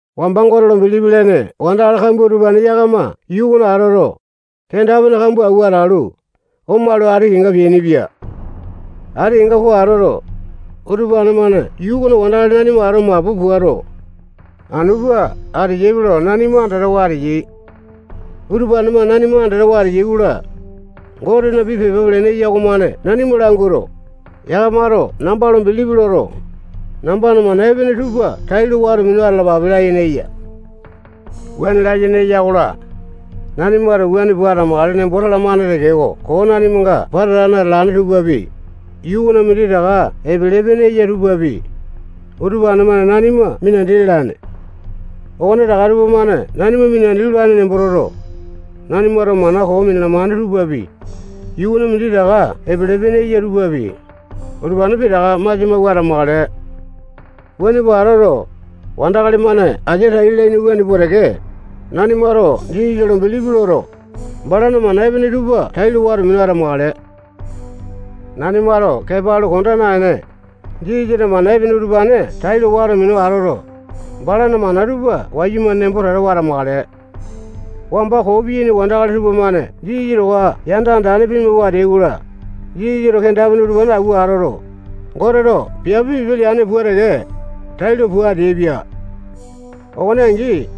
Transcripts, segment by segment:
Wamba Gote lo bilipi lene wandakali kambua utupane yakama yuu okona atoto, kenda-pene kambua awua atalu, omalu, ati kenga peainipia. Ati kenga po atoto, utupane-mane yuu okona wandakali nanima ato mapu puato, anu pua ateyaipe lo nanima andatawa ateyai. Utupane-mane nanima andatawa ateyai-kola, Gotena pii pepa pelene eya okomane nanima languato, yakamato namba lo bilipi loto, nambana mana epene tupa tailo wato minu atalapape layene eya. Wuane layene eya-kola, nanimato wuane pua atamakale nembo talamane tekeko, koo nanimanga pata atane atalane tupapi, yuu okona minditaka epele-pene eya tupapi, utupane-mane nanima minandi lalane. Okonetaka tupamane nanima minandi lolane nembo toto, nanimato mana koo minalamane tupapi, yuu okona minditaka epele-pene eya tupapi, utupane pitaka masia mawua atamakale. Wuane pua atoto, wandakali-mane asia tai lalaini wuane pua teke, nanimato Jisasa lo bilipi loto, balana mana epene tupa tailo wato minu atamakale. Nanimato kepa alu konda naene, Jisasana mana epene utupane tailo wato minu atoto, balana mana tupa wayumane nembo tatawa atamakale. Wamba koo piyaini wandakali tupamane Jisasa towa yanda andane pimawua ateai-kola, Jisasato kenda-pene utupane awua atoto, Goteto piape pipe leane pua teke, tailo pua ateaipia. Okone angi,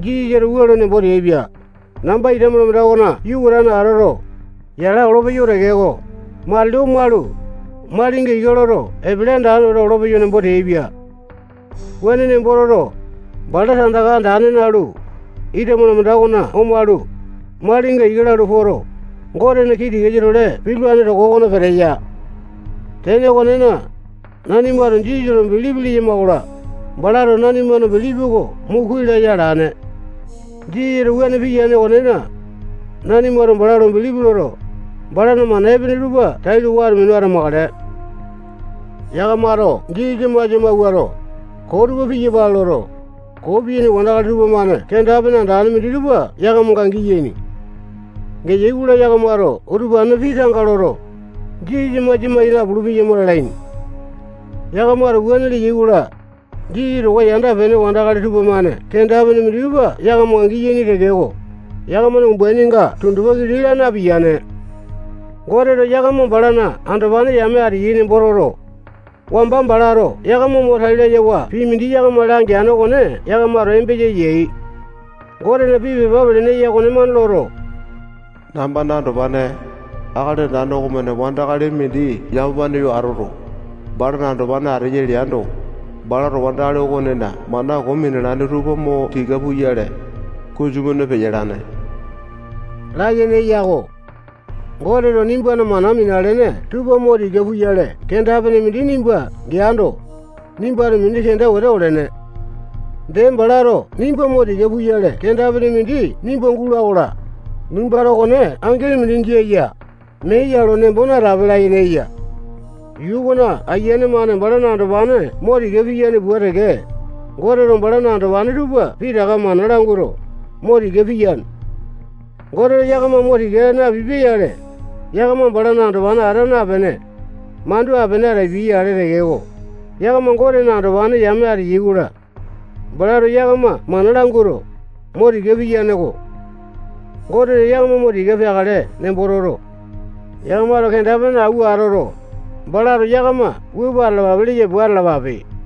Jisasato wua lo nembo teaipia: Namba ita malamanda okona yukatane atoto, yala olopeyo tekeko, matili omalu, malinga ika loto, epele andane wete olopeyo nembo teaipia. Wuane nembo toto, bala tandaka andane nalu, ita malamanda okona omalu, malinga ika lalu poto, Gotena kii tikasa-tole pitulane toko okona peteya. Tene okonena, nanimato Jisasa lo bilipi leyama-kola, balato nanimana bilipi oko mo kuai laya alane. Jisasato wuane piyane okonena, nanimato bala lo bilipi loto, balana mana epene tupa tailo wato minu atamakale. Yakamato Jisasa masia mawuato, koo tupa piyapale loto, koo piyaini wandakali tupamane kenda-pene andane minditupa yakamanga giyaini. Geyai-kola, yakamato utupanena pii tanga loto, Jisasa masia mai napulu-peyama lalaini. Yakamato wuane leyai-kola, Jisasa towa yanda-pene wandakali tupamane kenda-pene minditupa yakamanga giyaini tekeko, yakamana umbaininga tundupa kili laa napiyane. Goteto yakama balana andopane yame ateyai nembo toto, wamba balato yakama mo tai layawa pii mindi yakama langeane okone yakamato embesa yai. Gotena pii pepa pelene eya okonemane loto, nambana andopane, Akali Andane okomane wandakali mindi yamapane yo atoto, balana andopane ateya leando, balato wandakali okonena mana koo minalane tupa mo tika puyale, kunju-mane peyalane layene eya-ko. Goteto nimbana mana minalene tupa mo tika puyale kenda-pene mindi nimba geando, nimbato mini kenda wete olene. Dee, balato nimba mo tika puyale kenda-pene mindi nimba gula-kola, nimbato okone angini mindi jia ya, mee ya lo nembo natape layene eya. Yuu okona ayiane-mane balana andopane mo tika piyane pua teke, Goteto balana andopane tupa pitaka mana languato, mo tika piyane. Goteto yakama mo tika napipia-yale, yakama balana andopane ata napene, mandu apene atapia-yale tekeko, yakama Gotena andopane yame ateyai-kola, balato yakama mana languto, mo tika piyane-ko. Goteto yakama mo tika peakale nembo toto, yakamato kenda-pene awua atoto, balato yakama wua pua atalapa leya pua atalapape.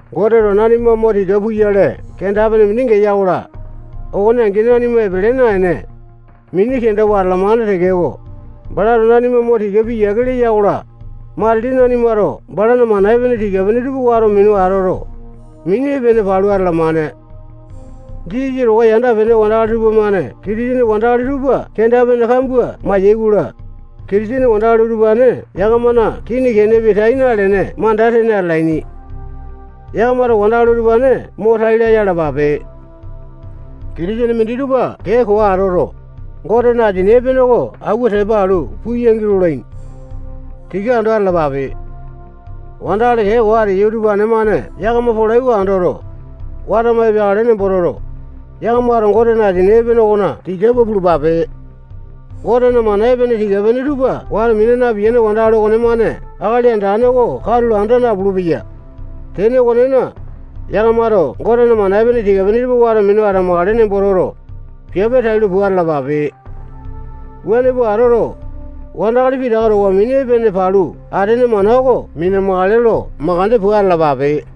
Goteto nanima mo tika puyale kenda-pene mindi geya-kola, okone angi nanima epele naene, mini kenda alamane tekeko, balato nanima mo tika piyiake leya-kola, matili nanimato balana mana epene tika-pene tupa wato minu atoto, mini epene palu atalamane. Jisasa towa yanda-pene wandakali tupamane Kitisene wandakali tupa kenda-pene kambua mai-yaikola, Kitisene wandakali utupane yakamana kini kenepi tai nalene manda tene atalaini. Yakamato wandakali utupane mo tai laya alapape. Kitisene minditupa kee koo atoto, Gotena asini epene oko awua tepa alu puyangi lolaini. Tika ando atalapape. Wandakali kee koo ateyai utupane-mane yakama polai oko andoto, watama epeakale nembo toto, yakamato Gotena asini epene okona tika pua pulupape. Gotena mana epene tika-pene tupa wato mina napiyane wandakali okonemane Akali Andane oko katulo anda napulu-peya. Tene okonena, yakamato Gotena mana epene tika-pene tupa wato minu atamakale nembo toto, piape tailo pua atalapape. Wuane pua atoto, wandakali pitaka towa mini epene palu atene mana oko mina-makale lo makande pua atalapape.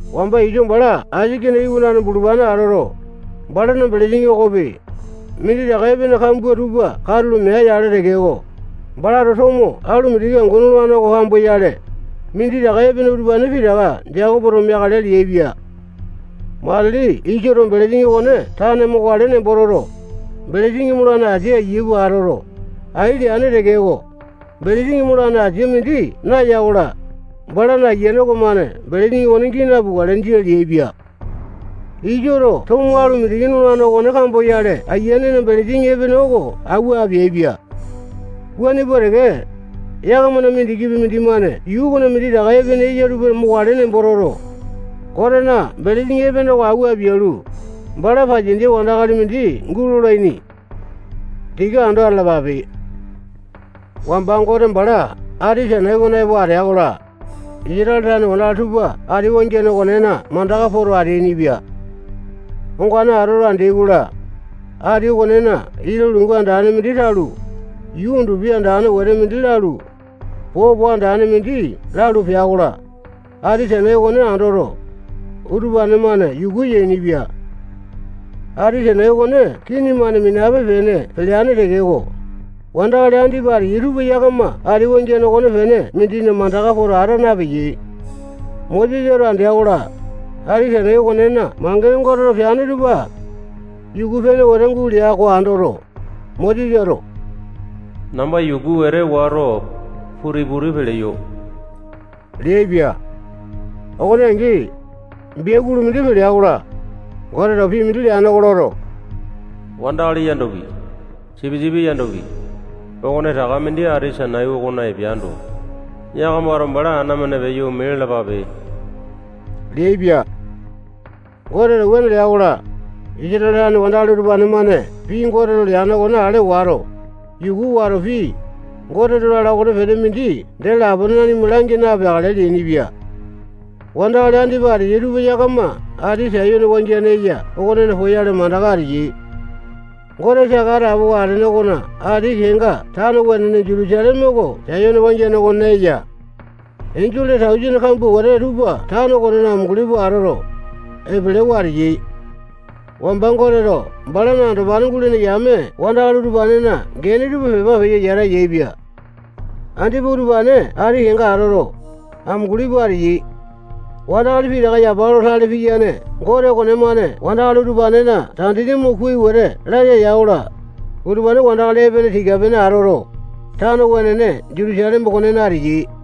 Wamba Iso bala Aisake iwanane bulupane atoto, balana belesini okopi, minditaka epene kambua tupa katulo mea-yale tekeko, balato tomo alu mindiki angu nolane oko kamboyale, minditaka epene utupane pitaka Jekopoto meakale leaipia. Matili Isoto belesini okone tane mokale nembo toto, belesini molane asia ayia pua atoto, ai leane tekeko, belesini molane asia mindi naya-kola, balana ayiane okomane belesini okone gii napukale. Jia leaipia. Isoto tomo alu mindiki nolane okone kamboyale ayianena belesini epene oko awua apeaipia. Wuane pua teke, yakamana mindikipi mindimane yuu okona minditaka epene eya tupa mokale nembo toto, Gotena belesini epene oko awua apialu, bala pasiandia wandakali mindi gulolane. Tika ando atalapape. Wamba Gote bala ati Sainai okona epo atea-kola, Isatale tane wandakali tupa ati wangiane okonena mandaka poto ateainipia. Ongane atoto, andeai-kola, ati okonena ita lungu andane mindi talu, yuu undupi andane wete mindi lalu, popo andane mindi lalu, pea-kola, ati Sainai okone andoto, utupane-mane yuku yainipia. Ati Sainai okone kini-mane minape-pene peleane tekeko, wandakali andipa ateyai tupa yakama ati wangiane okonepene mindina mandaka poto ata napeyai. Mosesato andea-kola, Ati Sainai okonena mangene Goteto peane tupa yuku-pene wete gulea oko andoto, Mosesato namba yuku wete wato, puti-puti peleyo leaipia. Okone angi, biakulu mindi pelea-kola, Goteto pii mindi leane oko loto, wandakali yandopi, sipisipi yandopi, okonetaka mindi ati Sainai okona epeando, yakamato bala ana-mane peyo ome lalapape leaipia. Goteto wuane lea-kola, Isatale tane wandakali utupane-mane pii Goteto leane okone ale wato, yuku wato, pii Goteto lala okonepene mindi dee lapone nanima langi napeakale leainipia. Wandakali andipa ateyai tupa yakama ati Sayone wangiane eya okonena poyale mandaka ateyai. Gote saka atapowa atene okona ati kenga tano wenene Jutusaleme oko Sayone wangiane okonena eya. Enjole tausene kambua wete tupa tano okonena amunguli pua atoto, epelewa ateyai. Wamba Goteto balana andopane gulene yame wandakali utupanena gene tupa pepa peyo yata yaepia. Andipa utupane ati kenga atoto, amunguli pua ateyai. Wandakali pitaka yapa lo tale piyane Gote okonemane wandakali utupanena tandini mo kuai wete laya ya-kola, utupane wandakali epene tika-pene atoto, tano wenene Jutusaleme okonena ateyai.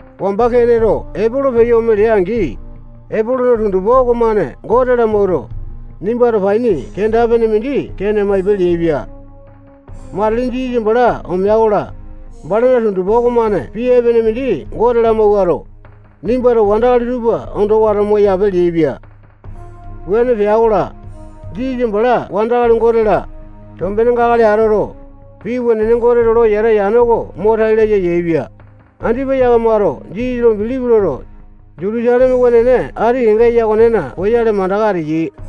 Wamba Keneto Epolo peyo ome lea-angi, Epolona tundupa okomane Gote lamawuato, nimbato paini kenda-pene mindi Kene maipe leaipia. Matili Jisasa bala omea-kola, balana tundupa okomane pii epene mindi Gote lamawuato, nimbato wandakali tupa ondo wato moyape leaipia. Wuane pea-kola, Jisasa bala wandakali, Gote-la, tombenenga akali atoto, pii wenene Goteto lo yata yane oko mo tai laya yaepia. Andipa yakamato Jisasa lo bilipi loto, Jutusaleme wenene ati kenga eya okonena poyale mandaka ateyai.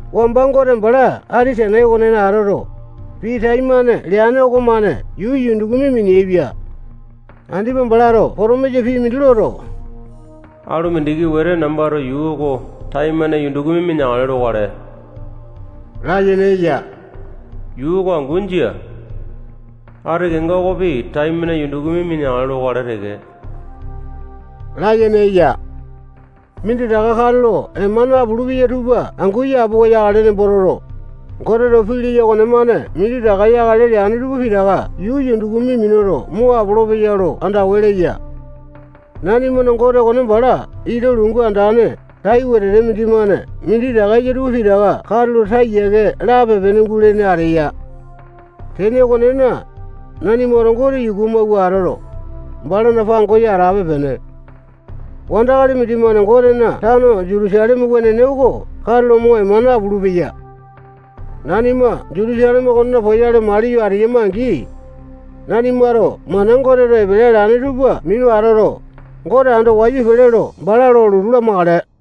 Wamba Gote bala ati Sainai okonena atoto, pii taimane leane okomane yuu yundukumi mineaipia. Andipa balato potomisa pii mindi loto, alu mindiki wete nambato yuu oko taimane yundukumi mineakale lokale layene eya. Yuu oko angu jia. Ati kenga okopi taimane yundukumi mineakale lokale teke layene eya. Minditaka katulo ema napula tupa angu yapowa yakale nembo toto, Goteto pii leya okonemane minditaka yakale leane tupa pitaka yuu yundukumi minuto mo apolopeya lo andawa leya. Nanimana Gote okone bala ita lungu andane tai wete mindimane minditaka eya tupa pitaka katulo taa yiake lape-pene gulene ateya. Tene okonena, nanimato Gote yuku amawua atoto, balana pangosa atape-pene. Wandakali mindimane Gotena tano Jutusaleme wenene oko katulo mo ema napulu-peya. Nanima Jutusaleme okonena poyale maliyo ateyama-angi, nanimato mana Goteto epele alane tupa minu atoto, Gote ando wayu pele lo bala lo lotu lamakale.